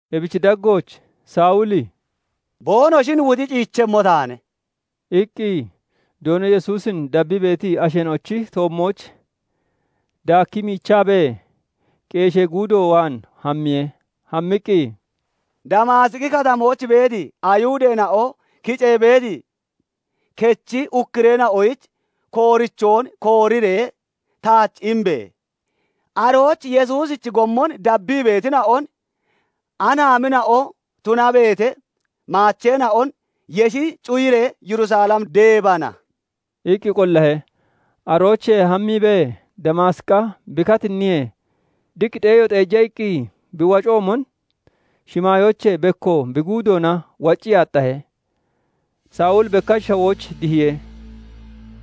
Ebichi daggooch Sawuli "Boonoshin wuxi ciichemmo taane" iqqi, Doono Yesuusin dabbii beeti asheena'ochi toommooch daakkii miichaabee, qeeshee guudo waan hammiye. Hammiqqi, "Damaasiqi Katamooch beeti Ayihudeena'o kicee beeti kechi ukkureena'oyich koorichoon kooriree taach imbe! Arooch Yesuusichi gommon dabbii beetina'on, anaamina'o tunabeete maacheena'on yeshi cuyiree Yerusalem deebana" iqqi qollahe. Aroochee hammiibee Damaasiqa bi katinniyee, diq xeeyo xeeja iqqi bi waccoomon shimaayoochee bekko bi guudoona waccii aaxxahe. Sawuli bekkach shawooch dihiye.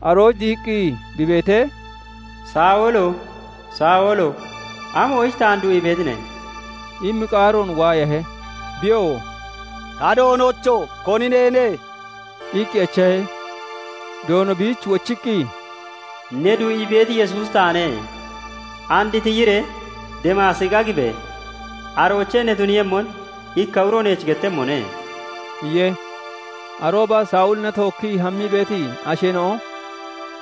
Arooch dihiqqi bi beetee, "Sawulo! Sawulo! Amoyich taan du'ii beetine?" immi qaaroon waayahe. Biyoo "Ta Doonocho! Koni neene?" iqqi echahe. Doono biich wochiqqi, "Ne du'ii beeti Yesuusi taane. And tiyiree Damaasiqa gibe! Aroochee ne tuniiyemmon ikka uro neech gettemmone" iye. Arooba Sawulina tookkii hammii beeti asheena'o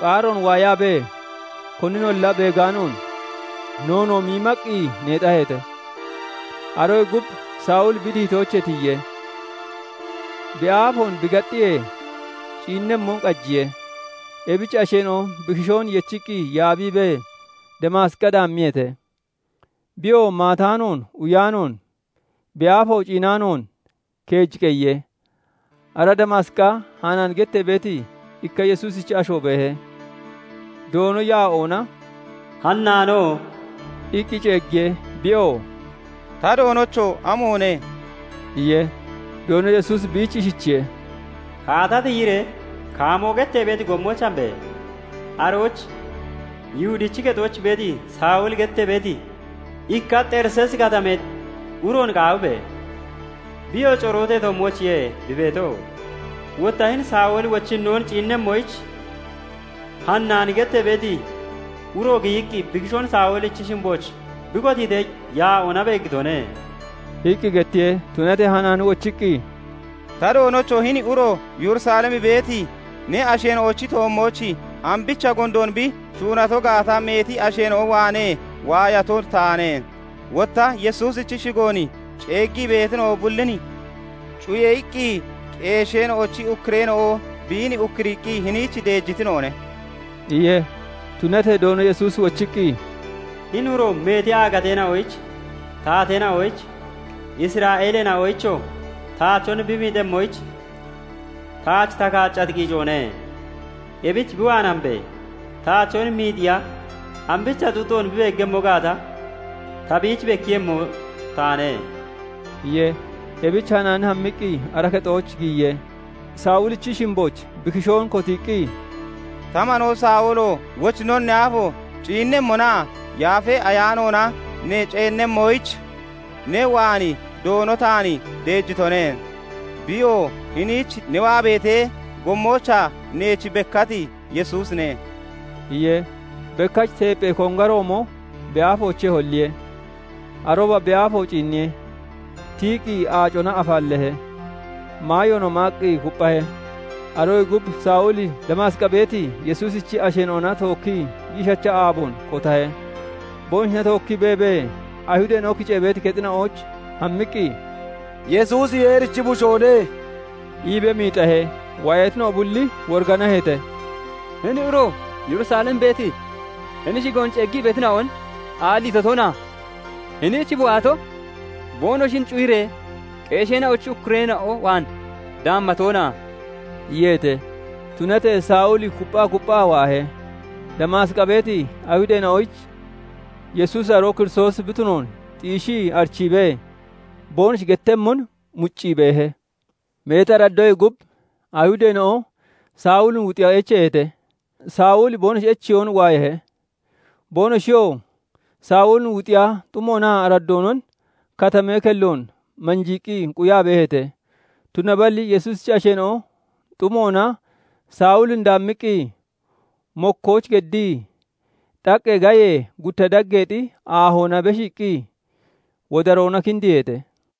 qaaroon waayaabee koninolla beegaanoon, noonoo miimaqqi neexaheete. Aroyee gub Sawuli bi dihitoochee tiyiye; bi aafoon bi gaxxiyee, ciinnemmon qajiye. Ebich asheena'o bi kishoon yechiqqi yaabiibee, Damaasiqa daammiyeete. Biyoo maataanoon, uyaanoon, bi aafo ciinaanoon keej qeyiye. Ara Damaasiqa Hanaani gettee beeti ikka Yesuusichi asho beehe; Doono yaa'oona "Hanaano!" iqqi ceeggiye. Biyoo "Ta Doonocho! Amoone?" iye. Doono Yesuusi biich ishichiye:- "Kaata tiyiree 'Kaamoo' gettee beeti gommooch hambe! Arooch Yihudichi kexooch beeti, Sawuli gettee beeti, ikka Xeriseesi Katamee uroon qaawibe! Biyoo corootee toommoochiye bi beeto. Wotta hini Sawuli wochinnoon ciinnemmoyich, Hanaani gettee beeti uro giyiqqi, bi kishoon Sawulichi shimbooch bi kotiitee, [yaa'oona] beeggitone" iqqi gettiye. Tunatee Hanaani wochiqqi, "Ta Doonocho! Hini uro Yerusalem beeti ne asheena'ochi toommooch ambicha gondoon bi shuunato gaata meeti asheena'o waanee waayato taane; wotta 'Yesuusichi shigoon ceeggii beetina'o bullin cuye!' iqqi qeesheena'ochi ukkureena'o biin ukkuriiqqi hiniich deejitina'one" iye. Tunatee Doono Yesuusi wochiqqi, "Hini uro meeti aagateena'oyich, taateena'oyich, Isra'eeleena'oyichoo taachon bi miixemmoyich taach ta kaaccati qiicoone. Ebich bi waan hambe! Taachon miixiya ambicha xuuxoon bi beeggemmo gaata ta biich bekkiiyemmo taane" iye. Ebich Hanaani hammiqqi ara kexooch giyiye; Sawulichi shimbooch bi kishoon kotiiqqi, "Ta manoo Sawulo! Wochinnoon ne aafo ciinnemmonaa Yaafa Ayaanoona ne ceennemmonoyich, ne waan Doono taan deejitone; Biyoo hiniich ne waa beetee, gommoochaa neech bekkati Yesuusine" iye. Bekkach teepphee kongaroomo bi aafoochee holliye. Arooba bi aafo ciinniye; tiyiqqi aacona afaalleehe; maayoonoo maaqqi kupphahe. Aroyee gub Sawuli Damaasiqa beeti Yesuusichi asheena'ona tookkii giishacha aaboon kotahe. Boonoshina tookkii beebee, Ayihudeena'o kicee beeti kexina'ooch hammiqqi, "Yesuusi Yeerichi Bushoone" iibee miixahe. Waayatina'o bulli woriganaheete; "Hini uro Yerusalem beeti hini shigoon ceeggii beetina'on aalliito toona? Hiniich bi waato, boonoshin cuyiree qeesheena'ochi ukkureena'o waan daamma toona?" iyeete. Tunatee Sawuli kupphaa kupphaa waahe; Damaasiqa beeti Ayihudeena'oyich Yesuusi aroo Kiristoosi bi tunoon xiishii arichiibee, boonoshi gettemmon muccii beehe. Meeti araddoyee gub Ayihudeena'o Sawulin wuxiya echeeheete; Sawuli boonoshi echeyoon waayahe. Boonoshiyoo Sawulin wuxiya xumoonaa araddoonon katamee kelloon manjiiqqi quyaa beeheete. Tunaballi Yesuusichi asheena'o xumoona Sawulin daammiqqi, mokkooch geddii xaqqee gayee gutta daggeexi aahoona beshiiqqi wodaroona kindiiheete.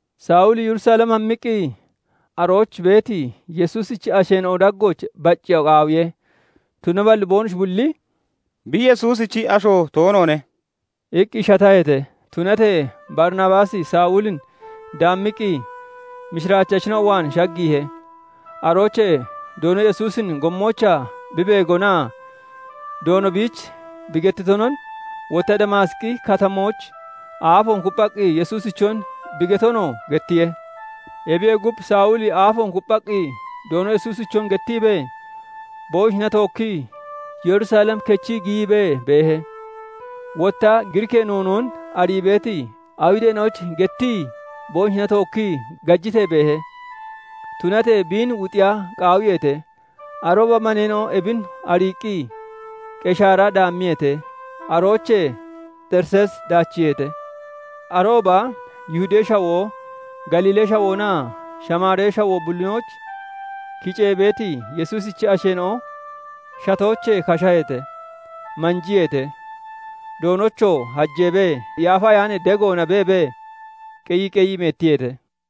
Sawuli Yerusalem hammiqqi, arooch beeti Yesuusichi asheena'o daggooch bacceeya qaawiye; tunaballi boonoshi bulli "Bi Yesuusichi asho toonoone" iqqi shataheete. Tunatee Barinabaasi Sawulin daammiqqi, mishiraachachina'o waan shaggiihe. Aroochee Doono Yesuusin gommoochaa bi beegonaa Doono biich bi getonon, wotta Damaasiqi Katamooch aafoon kupphaqqi Yesuusichon bi getonoo gettiye. Ebiyee gub, Sawuli aafoon kupphaqqi Doono Yesuusichon gettiibee, boonoshina tookkii Yerusalem kechii giyiibee beehe. Wotta Giriikee noonoon arii beeti Ayihudeena'oyich gettii boonoshina tookkii gajitee beehe; tunatee biin wuxiya qaawiyeete. Arooba maneena'o ebin ariiqqi Qeshaara daammiyeete; aroochee Xeriseesi daachiiheete. Arooba Yihudee Shawoo, Galiilee Shawoonaa Shamaaree Shawoo bullinooch kicee beeti Yesuusichi asheena'o shatoochee kashaheete; manjiyeete; Doonochoo hajeebee Yaafa Ayaanee degoona beebee qeyii qeyii meettiyeete.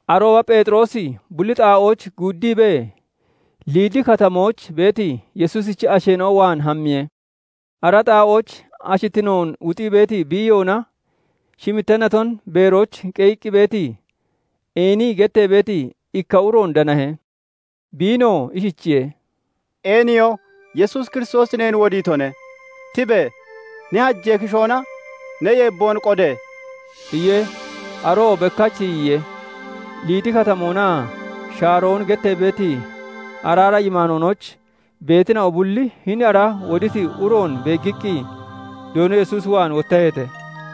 Arooba Pheexiroosi bulli xaa'ooch guuddiibee, Liidi Katamooch beeti Yesuusichi asheena'o waan hammiye. Ara xaa'ooch ashittinoon wuxii beeti biiyoona shimitta naton beerooch qeyiqqi beeti, Eeniyi gettee beeti ikka uroon danahe. Biinoo ishichiye:- "Eeniyo! Yesuus Kiristoosi neen wodiitone. Tibe! Ne hajee kishoona ne yeebboon qode!" iye. Aroo bekkach tiyiye. Liidi Katamoonaa Shaarooni gettee beeti araara yimaanoonooch beetina'o bulli hini ara woditi uroon beeggiqqi, Doono Yesuus waan wottaheete.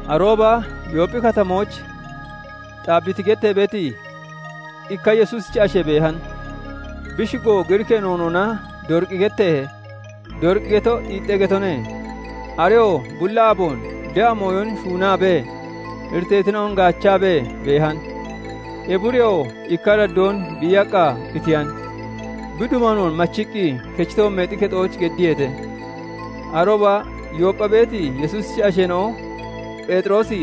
Arooba Yoopphi Katamooch Xaabbiti gettee beeti, ikka Yesuusichi ashe beehan. Bi shigo Giriikee noonoona Doriqi getteehe; Doriqi geto xiixxe getone. Areyoo bulli aaboon de'a mooyon shuunaabee, iriteetina'on gaachaabee beehan. Ebi ureyoo ikka araddoon biiyaqqa qitiyan; bi dubanoon machiqqi kechi toommeexi kexooch geddiyeete. Arooba Yooppha beeti Yesuusichi asheena'o Pheexiroosi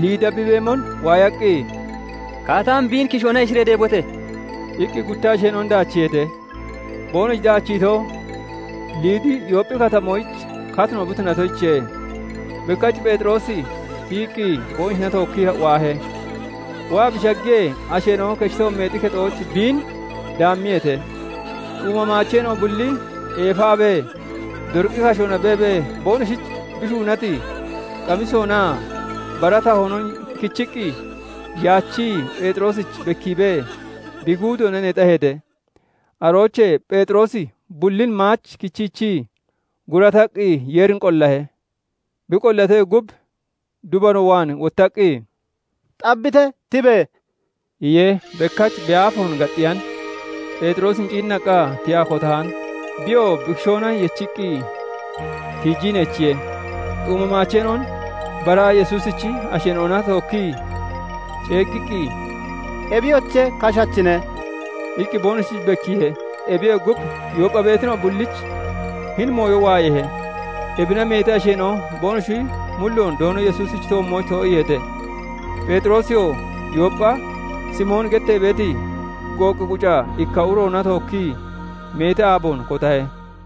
Liida bi beemon waayaqqi, "Kaata hami, biin kishoona yeshiree deebote!" iqqi gutta asheena'on daachiiheete. Boonoshi daachiito, Liidi Yoopphi Katamoyich katino bi tunatoyichiye. Bekkach Pheexiroosi tiyiqqi, boonoshina tookkii waahe. Waa bi shaggiyee, asheena'o kechi toommeexi kexooch biin daammiyeete. Xuuma maacheena'o bulli eefaabee, Doriqi kashoona beebee boonoshich bi shuunati qamisoonaa bara tahoonon kichiqqi yaachii Pheexiroosich bekkiibee bi guudoona neexaheete. Aroochee Pheexiroosi bullin maach kichiichii, gurataqqi Yeerin qollahe. Bi qollatoyee gub, dubano waan wottaqqi, "Xaabbite! Tibe!" iye. Bekkach bi aafoon gaxxiyan; Pheexiroosin ciinnaqqa tiyaa kotahan. Biyoo bi kishoona yechiqqi tiijii neechiye; xuuma maacheena'on bara Yesuusichi asheena'ona tookkii ceeggiqqi, "Ebiyoche, kashachine" iqqi boonoshich bekkiihe. Ebiyee gub, Yooppha beetina'o bullich hini mooyo waayeehe. Ebina meeti asheena'o boonoshi mulloon Doono Yesuusichi toommooch too'iiheete. Pheexiroosiyoo Yooppha Simooni gettee beeti, gooqqi quca ikka uroona tookkii meeti aaboon kotahe.